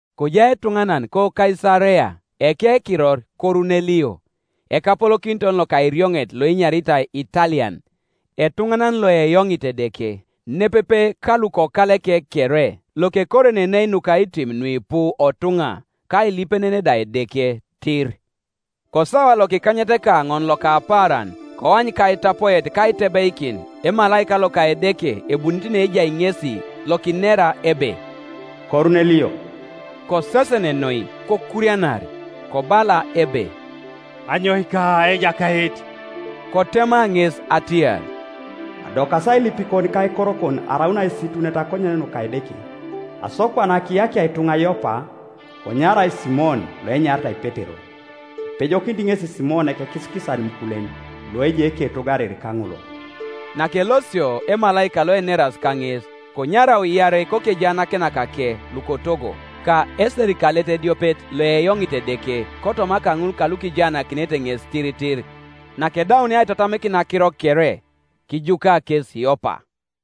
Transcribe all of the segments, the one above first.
Kojai etuŋanan koKaisarea ekekiror Korunelio, ekapolokiton loka erioŋet loenyaritai Italian, etuŋanan loeyoŋit Edeke, nepepe ka lukokaleke kere, lokekorenenei nukaitim nuipu otuŋa, ka ailipenen da Edeke tir. Kosawa lokikanyetekaoŋon loka apaaran koany kaitapoet kaitebeikin emalaika loka Edeke ebunit neejai ŋesi, lokinera ebe, “Korunelio.” Kosesen noi, kokurianar, kobala ebe, “Anyoika, Ejakait?” Kotema ŋes atiar, “Adokasi ailipikon ka aikorokon araun aisitunet akonyen nuka Edeke. Aso kwana kiyakia ituŋa Yopa, konyarau Simon loenyaritai Petero: Ipejokinit ŋesi Simon, ekekisikisan imukulen, loejai eketogo ariri kaŋolol.” Nakelosio emalaika loeneras kaŋes, konyarau iarei kokejaanakinakake lukotogo, ka eserikalet ediopet loeyoŋit Edeke kotoma kaŋul kalukijaanakinete ŋes tiritir; nakedaunia aitatamikin akiro kere, kijuka kes Yopa.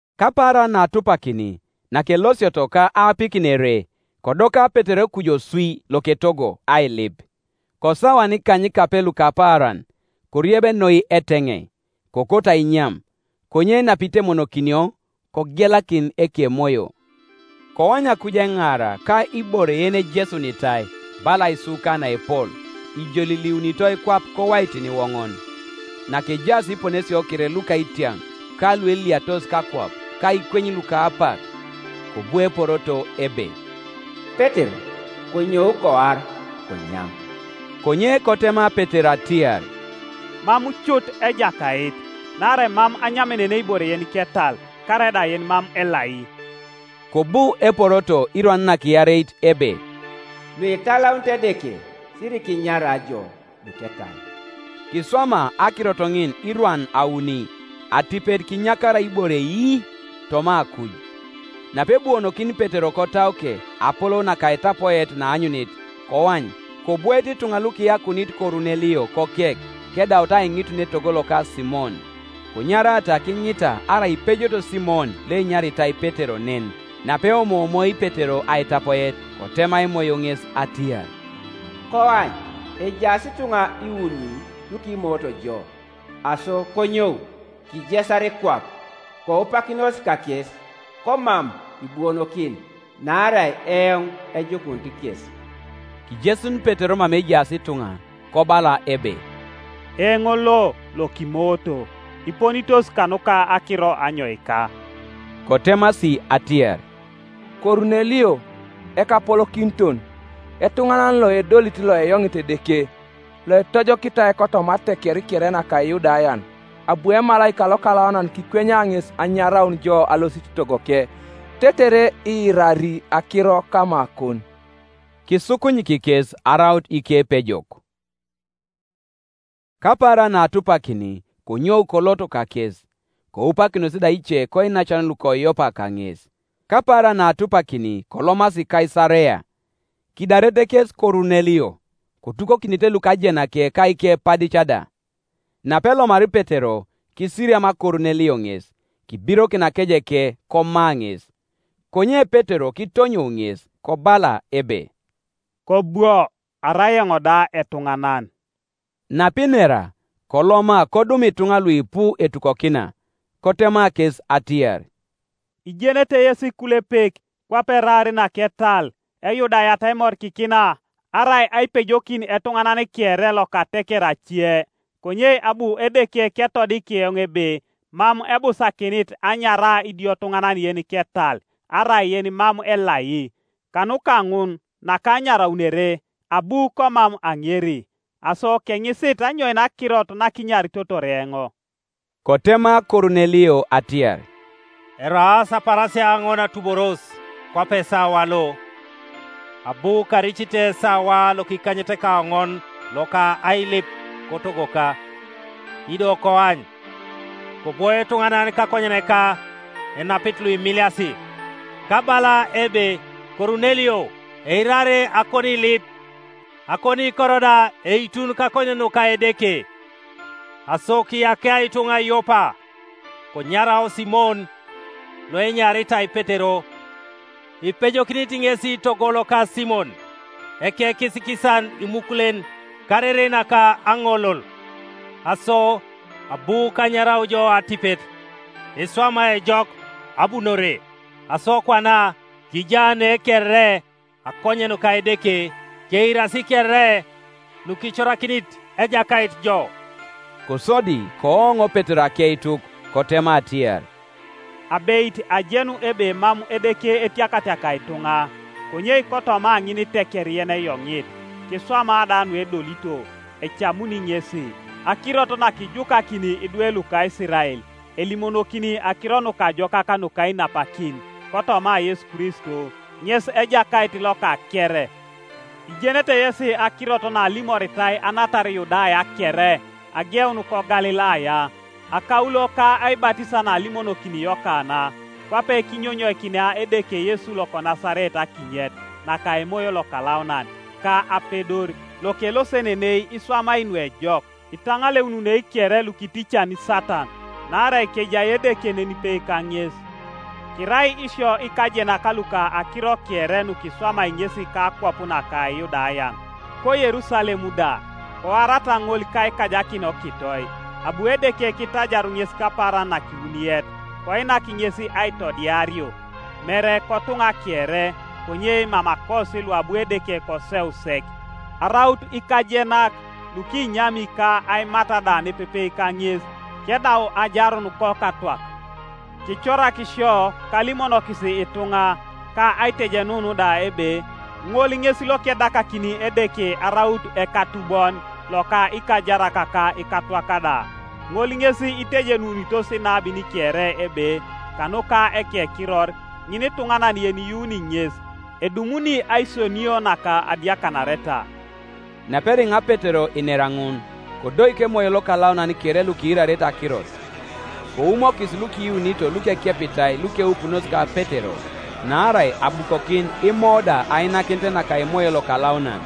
Kapaaran naatupakini, nakelosioto, ka aapikin ere, kodoka Petero kuju oswi loketogo ailip, kosawan ikanykape luka paaran. Korieb noi eteŋei, kokoto ainyam: konye napitemonokinio, kogelakin ekemoyo, koany akuj eŋaara, ka ibore yenejesunitai, bala aisuka naepol, ijoliliunitoi kwap kowaitin iwoŋon, Nakejaas iponesio kere luka itiaŋ, ka lueliatos kakwap, ka ikweny luka apak, Kobu eporoto ebe, “Petero, konyou; koar, konyam.” Konye kotema Petero atiar, “Mam cut, Ejakait; naarai mam anyamenenei ibore yeniketal, karaida yenimam elai.” Kobu eporoto irwan nakiareit ebe, “Luitalaunit Edeke, sirikinyara ijo luketal.” Kiswama akirot ŋin irwan auni, atipet kinyakarai ibore ii toma akuj. Napebuonokin Petero kotauke apolou naka aitapoet naanyunit, koany, kobwoete ituŋa lukiyakuunit Korunelio kokek, kedaut aiŋitun etogo loka Simon, Konyarata kiŋita arai ipejot Simon loenyaritai Petero nen. Napeomoomoi Petero aitapoet, kotema Emoyo ŋes atiar, “Koany, ejaas ituŋa iuni lukimooto jo. Aso konyou, kijesar kwap, koupakinos kakes komam ibuonokin; naarai eoŋ ejukunit kes.” Kijesun Petero mama ejaas ituŋa, kobala ebe, “Eoŋ lo lokimooto; iponitos kanuka akiro anyoika?” Kotemasi atiar, “Korunelio, ekapolokiton, etuŋanan loedolit Ioeyoŋit Edeke, loitojokitai kotoma ateker kere naka Iyudayan, abu emalaika lokalaunan kikwenya ŋes anyaraun jo alosit togoke, tetere iirari akiro kamakon.” Kisukunyik kes araut ikepejok. Kapaaran naatupakini konyou kolot kakes, koupakinos da ice koinacan luko Yopa kaŋes. Kapaaran naatupakini kolomasi Kaisarea. Kidaret kes Korunelio, kotukokinite lukajenake ka ikepadic da. Napelomari Petero, kisiriam Korunelio ŋes, kibirokin akejeke, koma ŋes. Konye Petero kitonyou ŋes, kobala ebe, “Kobwo; arai eoŋ da etuŋanan.” Napinera, koloma kodum ituŋa luipu etukokina; kotema kes atiar, “Ijenete yesi ikulepek kwape eraar naketal Eyudayat aimorikikina arai aipejokin etuŋanan kere loka ateker ace; konye abu Edeke ketodik eoŋ ebe mam ebusakinit anyara idiotuŋanan yeniketal arai yenimam elai. Kanuka ŋun nakanyaraunere, abu komam aŋeri, Aso keŋisit anyoin akirot nakinyaritotor eoŋ.” Kotema Korunelio atiar, “Eraas apaarasia aoŋon atuboros, kwape esawa lo, abu karicite esawa lokikanyetekaoŋon loka ailip kotogoka; ido koany, kobwo etuŋanan kakonyeneka enapit luimiliasi, kabala ebe, ‘Korunelio, eirar akoniilip, akoniikor da eitun kakonyen nuka Edeke. Aso kiyakia ituŋa Yopa, konyarau Simon loenyaritai Petero; ipejokinit ŋesi togo loka Simon, ekekisikisan imukulen, kariri naka aŋolol.’ Aso abu kanyarau jo atipet, iswama ejok abunore. Aso kwana kija ne kere akonyen nuka Edeke, keirasi kere nukicorakinit Ejakait jo.” Kosodi kooŋ Petero akeituk, kotema atiar, “Abeit ajenu ebe mam Edeke etiakatiakai ituŋa, konye kotoma ŋiniteker yeneyoŋit, kiswama da nuedolito, ecamuni ŋesi. Akirot nakijukakini idwe luka Isirael, elimonokini akiro nukajokak nuka ainapakin kotoma Yesu Kristo, (ŋes Ejakait loka kere,) ijenete yesi akirot naalimoritai anatar Yudaya kere, ageun koGalilaya, akaulo ka aibatisa naalimonokini Yokana; Kwape kinyonyoikinia Edeke Yesu loko Nasaret akinyet naka Emoyo Lokalaunan ka apedor; lokelosenenei iswamai nuejok, itaŋaleununei kere lukiticani Satan, naarai kejai Edeke nenipe kaŋes. Kirai isio ikajenak luka akiro kere nukiswamai ŋesi kakwap naka Iyudayan, koYerusalem da; koarata ŋol kaikajakin okitoi. Abu Edeke kitajaru ŋes kapaaran nakiwuniet, koinak ŋes aitodiario; mere kotuŋa kere, konye mamakosi luabu Edeke koseu sek araut ikajenak, lukinyami ka aimat da nepepe kaŋes kedau ajarun kokatwak. Kicorak sio kalimonokis ituŋa, ka aitejenun da ebe ŋol ŋes lekedakakini Edeke araut ekatubon loka ikajarak ka ikatwak da. Ŋol ŋes itejenunitos inabin kere ebe kanuka ekekiror ŋinituŋanan yeniyuuni ŋes edumuni aisionio naka adiakanareta.” Naperiŋa Petero inera ŋun, kodoik Emoyo Lokalaunan kere lukiirarete akirot. Koumokis lukiyuunito lukekepitai lukeupunos ka Petero, naarai abukokin Imo da ainakinet naka Emoyo Lokalaunan.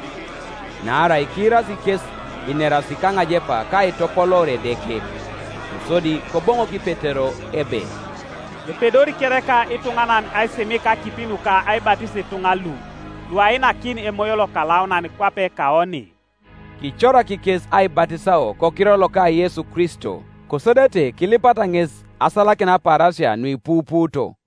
Naarai kiirasi kes ineras kaŋajepa ka aitopoloor Edeke. Kosodi Koboŋok Petero ebe, “Epedori kereka ituŋanan aisimik akipi nuka aibatis ituŋa lu, luainakin Emoyo Lokalaunan kwape kaoni?” Kicorak kes aibatisao kokiror loka Yesu Kristo. Kosodete kilipata ŋes asalakin apaarasia nuipupuuto.